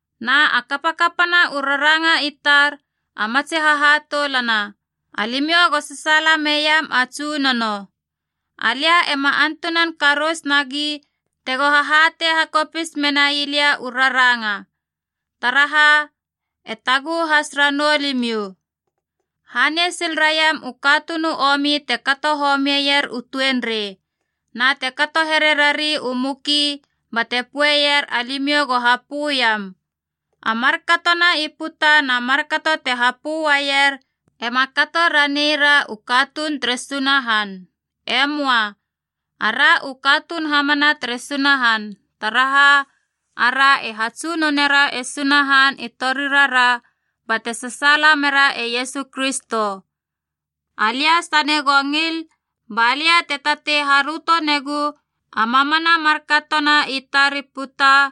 Na a kapakapana u raranga i tar a matsi hahatoulana, alimiou go sasaala meiam a Tsunono. Alia ema antunan karous nagi tego hahatei hakopis menai lia u raranga. Taraha e taguhu has ranou limiou. Hanei sil raiam u katuun u omi te kato homieier u tuenrei, na te kato here rari u muki, bate poeier alimiou go hapöiam. A markatona i puta na markato te hapö uaier ema kato raneira u katuun tere Sunahan. E möa. Ara u katuun hamana tere Sunahan, taraha ara e hatsunonera e Sunahan i torirara bate sasaala mera e Iesu Kristo. Alia sane go ngil, ba lia te tatei haröto negu a mamana markatona i tar i puta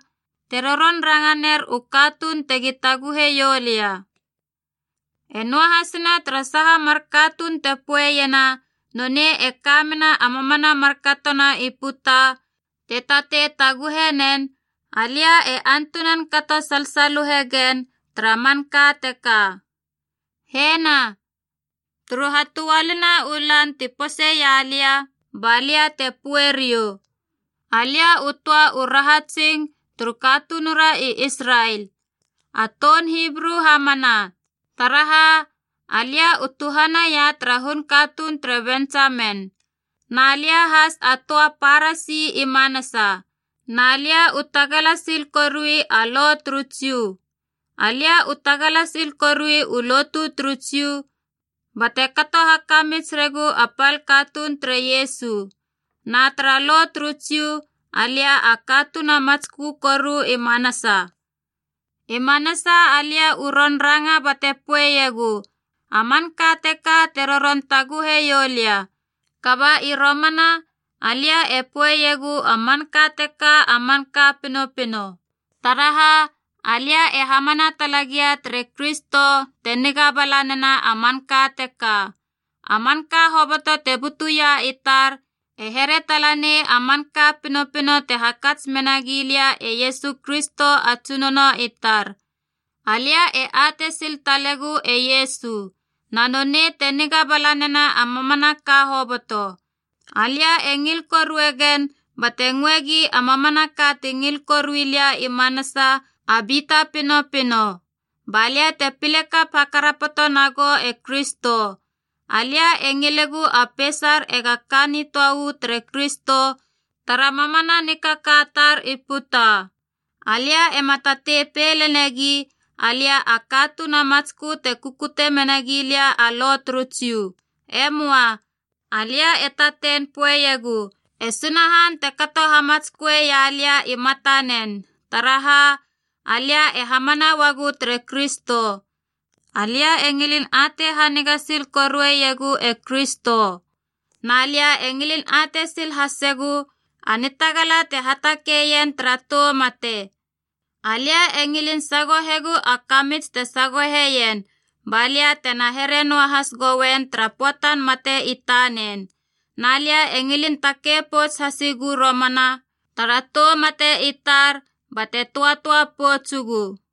te roron ranga ner u katuun tego taguhe ioulia. E noahasina tara saha mar katuun te poeiena nonei e ka mena a mamana markatona i puta te tatei taguhe nen, alia e antunan kato salsaluhe gen tara manka teka. Hena, turu hatöalina u lan ti poseia lia, ba lia e pöe riou. Alia u töa u rahatsing turu katunura i Israel, a toun Hibru hamana, taraha alia u tuhanaia tara hun katuun tere Bentsamen. Na lia has a töa Parasi i manasa, na lia u tagala sil korui a Lo turu Jiu. Alia u tagala sil korui u lotu turu Jiu bate kato hakamits regu a pal katuun tere Iesu. Na tara Lo turu Jiu, alia a katuun a matskö koru i manasa. I manasa alia u ron ranga bate poeiegu a manka teka te roron taguheiou lia. Kaba i romana alia e poeiegu a manka teka a manka pinopino, taraha alia e hamana tala gia tere Kristo te niga bala nena a manka teka. A manka hoboto te butuia i tar e here tala nei a manka pinopino te hakats menagi lia e Iesu Kristo a Tsunono i tar. Alia e atei sil talegu e Iesu, na nonei te niga bala nena a mamanaka hoboto. Alia e ngil korue gen bate ngöe gi a mamanaka ti ngil korui lia i manasa a bita pinopino. Ba lia te pile kap hakarapoto nagou e Kristo. Alia e ngilegu a peisar ega ka nitöa uu tere Kristo tara mamana nikaka tar i puta. Alia ema tatei pei lenegi alia a katuun a matskö te kukute mena gilia a Lo turu Jiu. E möa. Alia e tatei poeiegu e Sunahan te kato hamatsköe ialia i matanen, taraha alia e hamana uagu tere Kristo. Alia e ngilin atei haniga sil korueiegu e Kristo. Na lia e ngilin atei sil hasegu a nitagala te hatakei ien tara tou mate. Alia e ngilin sagohegu a kamits te sagoheien, ba lia tena here noahase goien tara pöatan mate i tanen. Na lia e ngilin takei pouts hasigu romana tara tou mate i tar bate töatöa poutsugu.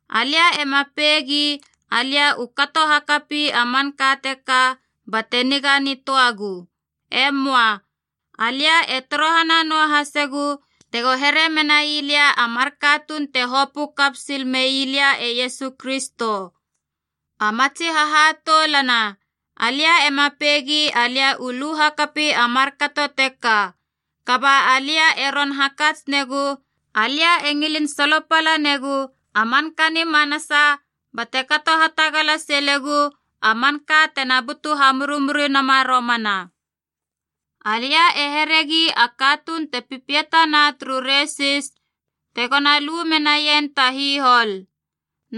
Alia ema peigi alia u kato hakapi a manka teka bate niga nitöagu. E möa. Alia e torohana noahasegu tego here menai lia a mar katuun te hopö kap sil mei lia e Iesu Kristo. A matsi hahatoulana, alia ema peigi alia u lu hakapi a markato teka. Kaba alia e ron hakats negu, alia e ngilin solopala negu a manka ni manasa bate kato hatagala silegu a manka tena butu hamurimuri nama romana. Alia e heregi a katuun te pipiatana turu resis tegona lu menaien ta hihol.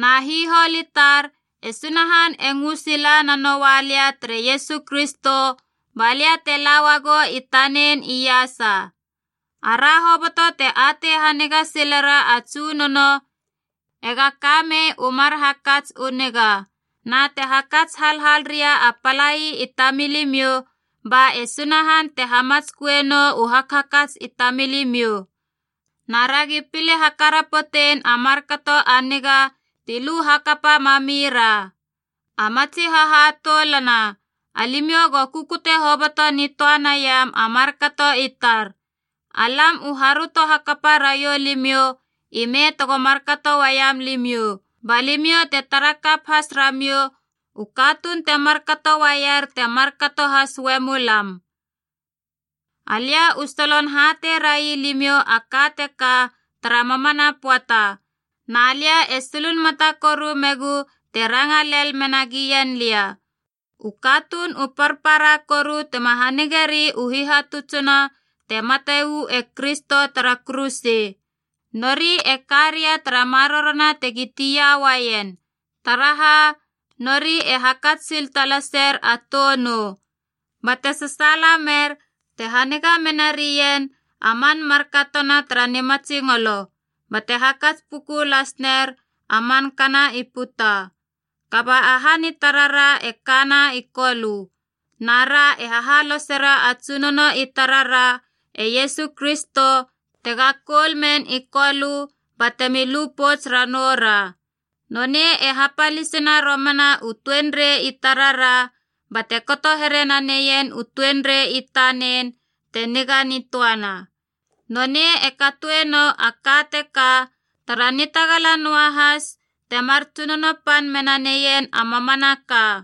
Na hihol i tar, e Sunahan e ngö sila nanoua lia tere Iesu Kristo ba lia te la uagou i tanen iasa. Ara hoboto te atei haniga silera a Tsunono ega kamei u mar hakats u niga. Na te hakats halhal ria a palai i tamilimiou, ba e Sunahan te hamatsköe nou u hakhakats i tamilimiou. Na ragi pile hakarapotein a markato a niga ti lu hakapa mamira. A matsi hahatoulana, alimiou go kukute hoboto nitöa neiam a markato i tar. Alam u haröto hakapa raiou limiou ime tego markato uaiam limiou, ba limiou te tara kap has ramiou u katuun te markato uaier te markato has uemu lam. Alia u solon hatei railimiou a ka teka tara mamana pöata, na lia e sulunmata koru megu te ranga lel mena gien lia: u katuun u parpara koru tema hanigeri u hihatutsina te mate uu e Kristo tara kuruse. Nori e ka ria tara marorona tegi tia uaien, taraha nori e hakats sil talaser a tou nou, bate sasaala mer te haniga menarien a man markatona tara nimatsingolo, bate hakats puku lasner a mankana i puta. Kaba a han i tarara e kana i Kolö, na ra e hahalosera a Tsunono i tarara e Iesu Kristo tega koul men i Kolö batemi lu pouts ranoura. Nonei e hapalisena romana u tuenrei i tarara bate kato here naneien u tuenrei i tanen te niga nitöana. Nonei e katoenou a ka teka tara nitagala noahas temar tsunono pan mena neien a mamanaka.